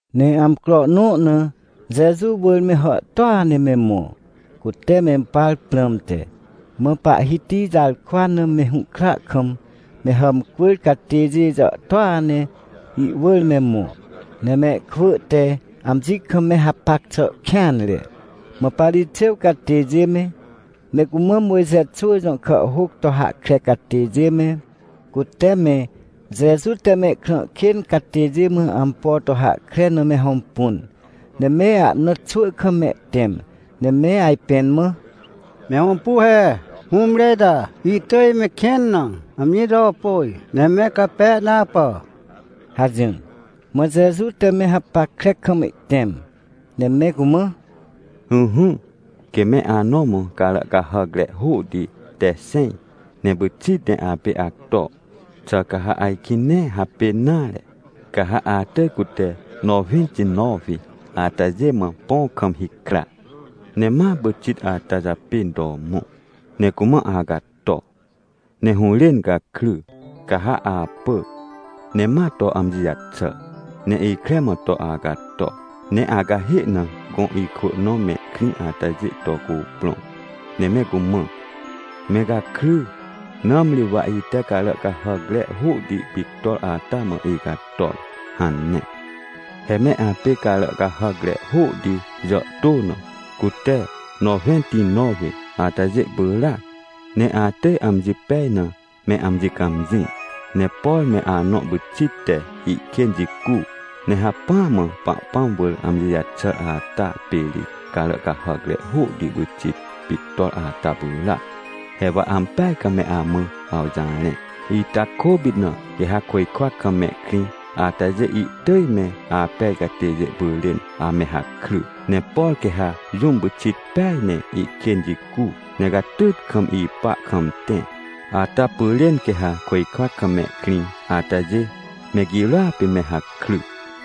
Ne amcro nõ na Jeju wỳr me hàhtôa ne me mõ, cute mempar prãmte, mã pahhiti jarkwa na me hũhkra kam me hàmcwỳr catêjê jàhtôa ne ihwỳr me mõ, ne mehkwỳ te amji kam me hapac xà kêanre. Mã Parixêw catêjê me, me cumã Mojxe xwỳ jõ kàhhôc to hahkre catêjê me, cute me Jeju te mehkrã kên catêjê mã ampo to hahkre na me hõmpun, ne me ahna xwỳ kam mehtẽm, ne me ajpẽn mã: ― Me hõmpu he, hũmre ita ihtỳj mehkên na amji to pôj, ne me cape na apà ― hajỹr. Mã Jeju te me hapackre kam ihtẽm, ne me cumã: ― Ỹhỹ, quê me anõ mã carà cahàcre hôhti te xẽj, ne pyxit ne apê acto, xà ca ha ajkĩ nee hapên nare? Ca ha atỳj cute nowẽntinowi atajê mã põ kam hikra, ne ma pyxit ata japên to mõ, ne cumã acato. Ne hũrên gakry, ca ha apỳ ne ma to amji jaxà. Ne ikre mã to acato, ne acahê na gõ ikwỳ nõ mehkrĩ atajê to cuprõ, ne me cumã: “Me gakry, nãmri wa ite carà cahàcre hôhti pictor ata mã icator” hane. ― He me apê carà cahàcre hôhti jàhtô na, cute nowẽntinowi atajê pyràac, ne atỳj amji pej na me amji cãmjĩ. Ne por me anõ pyxit te ihkên jicu, ne hacpỹa mã Pahpãm wỳr amji jaxàr ata pê ri carà cahàcre hôhti pyxit pictor ata pyràac. ― He wa ampeaj kam me amã awjarẽ, ita kôpit na, quê ha côjkwa kam mehkrĩ atajê ihtỳj me apej catêjê pyrên ame hakry. Ne por quê ha jũm pyxit peaj ne ihkên jicu, ne catyt kam ipa kam tẽ, ata pyrên quê ha côjkwa kam mehkrĩ atajê me girôa pê me hakry.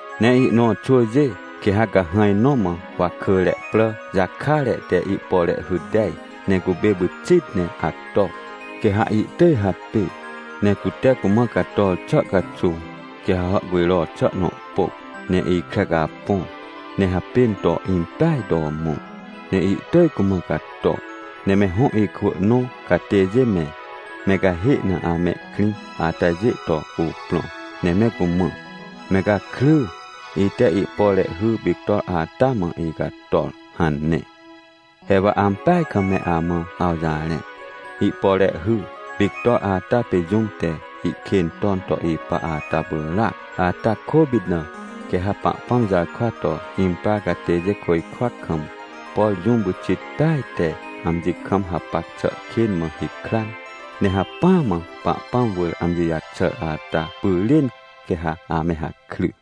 ― Ne ihnõ xwỳjê, quê ha cahãj nõ mã wakỳre prà jakare te ihpore hy tej, ne cupê pyxit ne acto, quê ha ihtỳj hapê. Ne cute cumã cator xà caxuw, quê ha hàhcujro xà nõ pôc, ne ikre capõ ne hapên to impeaj to mõ, ne ihtỳj cumã cato. Ne me hõ ikwỳ nõ catêjê me, me cahê na amehkrĩ atajê to cuprõ, ne me cumã: “Me gakry, ite ihpore hy pictor ata mã icator” hane. ― He wa ampeaj kam me amã awjarẽ, ihpore hy pictor ata pê jũm te ihkên ton to ipa ata pyràac. Ata kôpit na, quê ha Pahpãm jarkwa to imprar catêjê côjkwa kam, por jũm pyxit peaj te amji kam hapac xà kên mã hikran, ne hacpỹa mã Pahpãm wỳr amji jaxàr ata pyrên, quê ha ame hakry.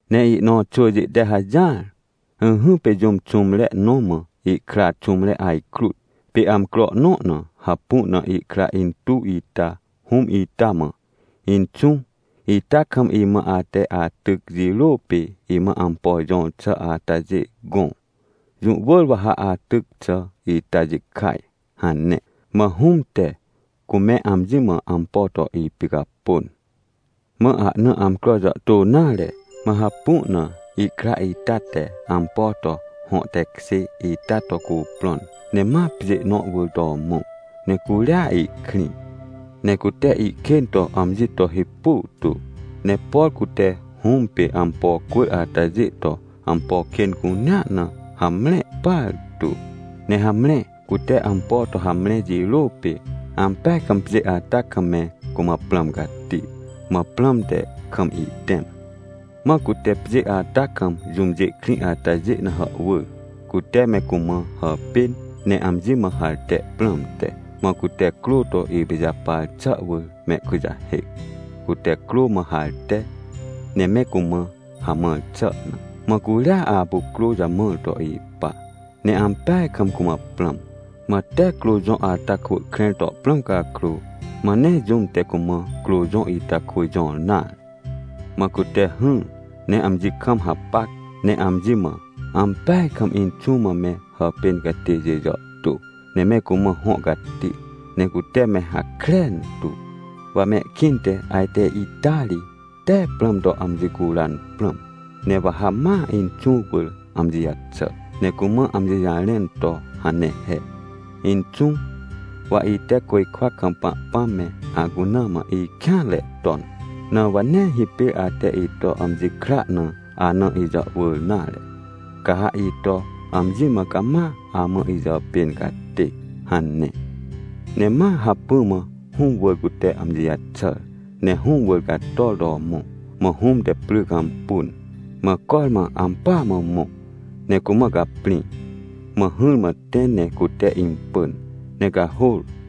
― Ne ihnõ xwỳjê te hajỹar. Ỹhỹ, pê jũm xũmre nõ mã ihkra xũmre ajkrut. Pê amcro nõ na hapu na ihkra intuw ita hũm ita mã: “Inxũ, ita kam imã ate atyc jirô pê imã ampo jõr xà atajê gõ. Jũ wỳr wa ha atyc xà ita jikaj” hane. Mã hũm te cume amji mã ampo to ipicapôn. ― Mã ahna amcro jàhtô nare, mã hapu na ihkra ita te ampo to hõ tekjê ita to cuprõn, ne ma pjê nõ wỳr to mõ. Ne curia ihkrĩ, ne cute ihkên to amji to hipu tu, ne por cute hũm pê ampo cwỳr atajê to ampo kên cunea na hamre partu. ― Ne hamre, cute ampo to hamre jirô pê, ampeaj kam pjê ata kam me cumã prãm cati. Mã prãm te kam ihtẽm. Mã cute pjê ata kam jũmjê krĩ atajê na hàhwỳr, cute me cumã hàpên ne amji mã harte prãmte. Mã cute crô to ipijapar xà wỳr mehkujahêc, cute crô mã harte, ne me cumã hamãr xà na. Mã curia apu crô jamãr to ipa, ne ampeaj kam cumã prãm. Mã tee crô jõ ata kwỳ krẽr to prãm cakrô, mã nee jũm te cumã crô jõ ita kwỳ jõr nare. ― Mã cute hỹr, ne amji kam hapac ne amji mã: “Ampeaj kam inxũ mã me hàpên catêjê jàhtô, ne me cumã hõ cati, ne cute me hakren tu. Wa mehkĩnte ajte ita ri tee prãm to amji curan prãm. Ne wa ha ma inxũ wỳr amji jaxà, ne cumã amji jarẽn to hane he: ‘Inxũ, wa ite côjkwa kam Pahpãm me, acuna mã ikêanre ton. Na wa nee hipêr ate ito amji kra na ana ijàhwỳr nare. Ca ha ito amji mã cama amã ijàpên catê’” hane. Ne ma hacpỹ mã hũm wỳr cute amji jaxàr. ― Ne hũm wỳr cator to mõ, mã hũm te pry cãmpun, mã cormã ampỳa mã mõ. Ne cumã caprĩ, mã hỹrmã tẽ ne cute impỳn, ne cahôr.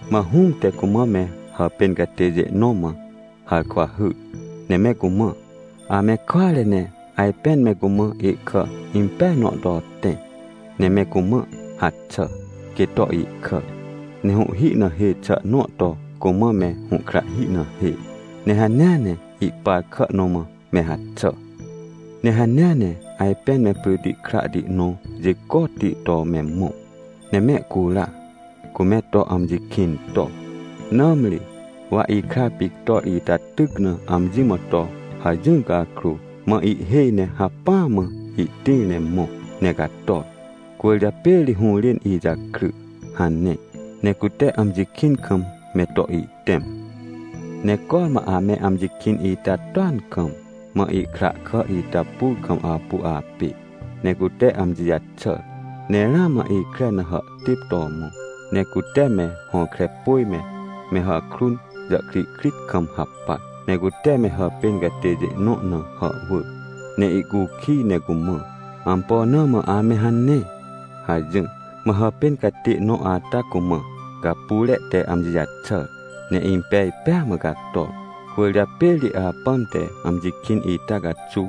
― Mã hũm te cumã me hàpên catêjê nõ mã harkwa hyr, ne me cumã: “Ame kware ne ajpên me cumã ihkà impeaj nõ to tẽ, ne me cumã haxà, quê to ihkà. Ne hũhhi na hê xà nõ to cumã me hũhkrahhi na hê, ne hanea ne ihpar kà nõ mã me haxà. Ne hanea ne ajpên me pryti krahti nõ jicotti to me mõ, ne mehcura, cume to amji kĩn to. Nãmri, wa ikra pictor ita tyc na amji mã to hajỹr cakrô, mã ihhêj ne hacpỹa mã ihtĩr ne mõ ne cator, cwỳrjapê ri hũrên ijakry” hane. Ne cute amji kĩn kam me to ihtẽm. ― Ne cormã ame amji kĩn ita toan kam, mã ihkra kà ita pur kam apu apê. Ne cute amji jaxàr, ne ramã ikre na hàhtêp to mõ, ne cute me hõkrepôj me, me hàkrun jàhkrihkrit kam hapac. Ne cute me hàpên catêjê nõ na hàhwỳr, ne ihcukij ne cumã: “Ampo na mã ame hane?” hajỹr. ― Mã hàpên catê nõ ata cumã: “Gapyre te amji jaxàr ne impej pêa mã cator. Cwỳrjapê ri apãm te amji kĩn ita caxuw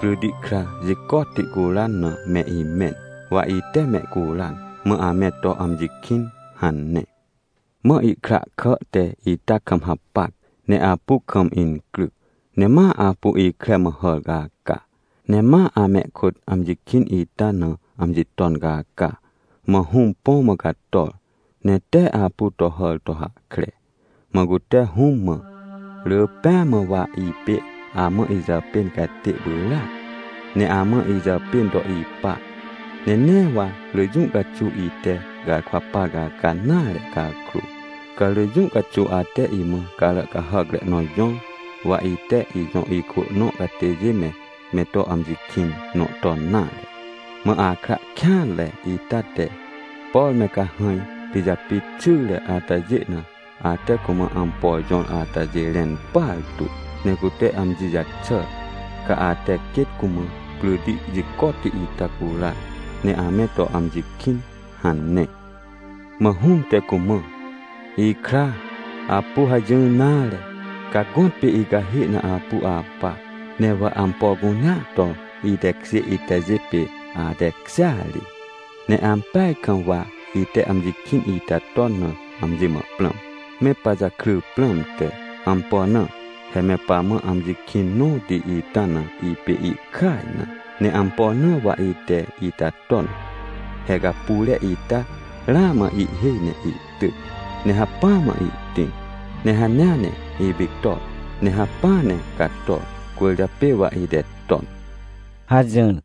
pryti kra jicotti curan na me imẽn, wa ite mehcuran, mã ame to amji kĩn” hane. ― Mã ihkra kà te ita kam hapac, ne apu kam incryc. Ne ma apu ikre mã hàr caca, ne ma amehkôt amji kĩn ita na amji ton caca. Mã hũm põ mã cator, ne tee apu to hàr to hahkre. Mã cute hũm mã: “Rỳ pêa mã wa ipê amã ijàpên catê pyràac, ne amã ijàpên to ipa. Ne nee wa rỳ jũ caxuw ite garkwa par caca nare cakrô, ca rỳ jũ caxuw ate imã carà cahàcre nõ jõr, wa ite ijõ ikwỳ nõ catêjê me, me to amji kĩn nõ ton nare. Mã akra kêanre ita te, por me cahãj pijapit xyre atajê na, ate cumã ampo jõr atajê rẽn partu. Ne cute amji jaxàr, ca ate quêt cumã pryti jicotti ita curan, ne ame to amji kĩn” hane. ― Mã hũm te cumã: “Ikra, apu hajỹr nare, ca gõtpê icahê na apu apa. Ne wa ampo cunea to itekjê itajê, pê atekjêa ri. Ne ampeaj kam wa ite amji kĩn ita ton na amji mã prãm, me pajakry prãmte. Ampo na? He me pamã amji kĩn nõti ita na ipê ihkaj na. Ne ampo na wa ite ita ton? He gapyre ita ramã ihhêj ne ihtyc, ne hacpỹa mã ihtĩr, ne hanea ne ipictor ne hacpỹa ne cator cwỳrjapê wa ite ton” ― hajỹr.